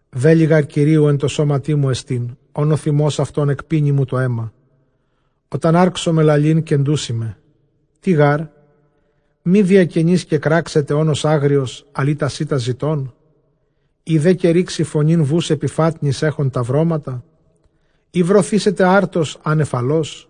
Βέλη γὰρ Κυρίου ἐν τῷ σώματί μου ἐστὶν, ὧν ὁ θυμὸς αὐτῶν ἐκπίνει μου τὸ αἷμα· ὅταν ἄρξωμαι λαλεῖν, κεντοῦσί με. Τί γάρ; μὴ διακενῆς κεκράξεται ὄνος ἄγριος, ἀλλʼ ἢ τὰ σῖτα ζητῶν; εἰ δὲ καὶ ῥήξει φωνὴν βοῦς ἐπὶ φάτνης ἔχων τὰ βρώματα; Εἰ βρωθήσεται ἄρτος ἄνευ ἁλός;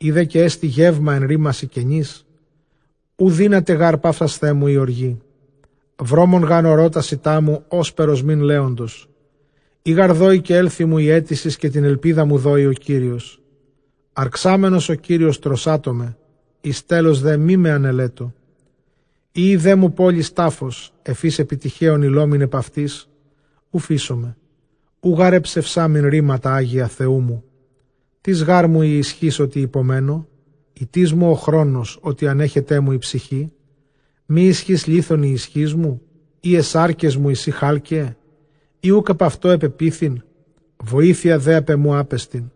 εἰ δὲ καὶ ἔστι γεῦμα ἐν ῥήμασι κενοῖς; Οὐ δύναται γὰρ παύσασθαί μου ἡ ὀργή· βρόμον γὰρ ὁρῶ τὰ σῖτά μου ὥσπερ ὀσμὴν λέοντος. Εἰ γὰρ δώῃ καὶ ἔλθοι μου ἡ αἴτησις, καὶ τὴν ἐλπίδα μου δώῃ ὁ Κύριος. Ἀρξάμενος ὁ Κύριος τρωσάτω με, εἰς τέλος δὲ μή με ἀνελέτω. Εἴη δέ μου πόλις τάφος, ἐφʼ ἧς ἐπὶ τειχέων ἡλλόμην, ἐπʼ αὐτῆς οὐ φείσομαι· οὐ γὰρ ἐψευσάμην ῥήματα ἅγια Θεοῦ μου. Τίς γάρ μου ἡ ἰσχύς, ὅτι ὑπομένω; τίς μου ὁ χρόνος, ὅτι ἀνέχεταί μου ἡ ψυχή; Μὴ ἰσχὺς λίθων ἡ ἰσχύς μου; ἢ αἱ σάρκες μου εἰσὶ χάλκεαι; Ἢ οὐκ ἐπʼ αὐτῷ ἐπεποίθειν; βοήθεια δὲ ἀπʼ ἐμοῦ ἄπεστιν.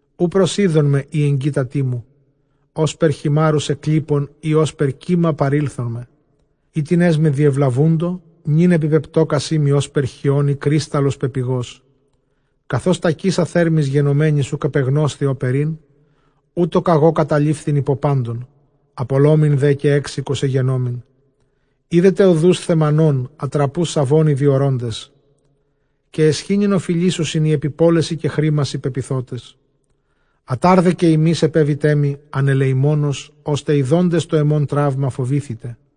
Οὐ προσεῖδόν με οἱ ἐγγύτατοί μου, ὥσπερ χειμάῤῥους ἐκλείπων, ἢ ὥσπερ κῦμα παρῆλθόν με Οἵτινές με διευλαβοῦντο, νῦν ἐπιπεπτώκασί μοι ὥσπερ χιὼν ἢ κρύσταλλος πεπηγώς· Καθὼς τακεῖσα θέρμης γενομένης, οὐκ ἐπεγνώσθη ὅπερ ἦν, οὕτω κᾀγὼ κατελείφηθν ὑπὸ πάντων, ἀπωλόμην δὲ καὶ ἔξοικος ἐγενόμην. Ἴδετε ὁδοὺς Θαιμανῶν, ἀτραποὺς, Σαβῶν οἱ διορῶντες. Καὶ αἰσχύνην ὀφειλήσουσιν, οἱ ἐπὶ πόλεσι καὶ χρήμασι πεποιθότες. Ἀτὰρ δὲ καὶ ὑμεῖς ἐπέβητέ μοι ἀνελεημόνως, ὥστε ἰδόντες τὸ ἐμὸν τραῦμα φοβήθητε.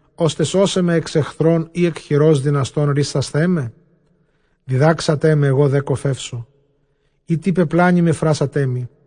ὥστε σῶσαί με ἑξ ἐχθρῶν, ἢ ἐκ χειρὸς δυναστῶν ῥύσασθαί με; Διδάξατέ με, ἐγὼ δὲ κωφεύσω· εἴ τι πεπλάνημαι, φράσατέ μοι.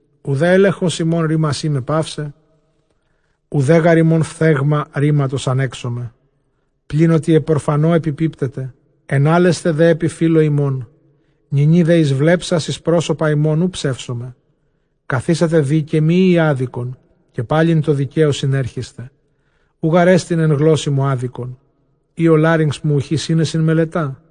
Οὐδὲ ἔλεγχος ὑμῶν ῥήμασί με παύσει, οὐδὲ γὰρ ὑμῶν φθέγμα ῥήματος ἀνέξομαι. Πλὴν ὅτι ἐπʼ ὀρφανῷ ἐπιπίπτετε, ἐνάλλεσθε δὲ ἐπὶ φίλῳ ὑμῶν. Νυνὶ δὲ εἰσβλέψας εἰς πρόσωπα ὑμῶν, οὐ ψεύσομαι. Καθίσατε δὴ καὶ μὴ εἴη ἄδικον, καὶ πάλιν τῷ δικαίῳ συνέρχεσθε. Οὐ γάρ ἐστιν ἐν γλώσσῃ μουἄδικον, ἢ ὁ λάρυγξ μου οὐχὶ σύνεσιν μελετᾷ.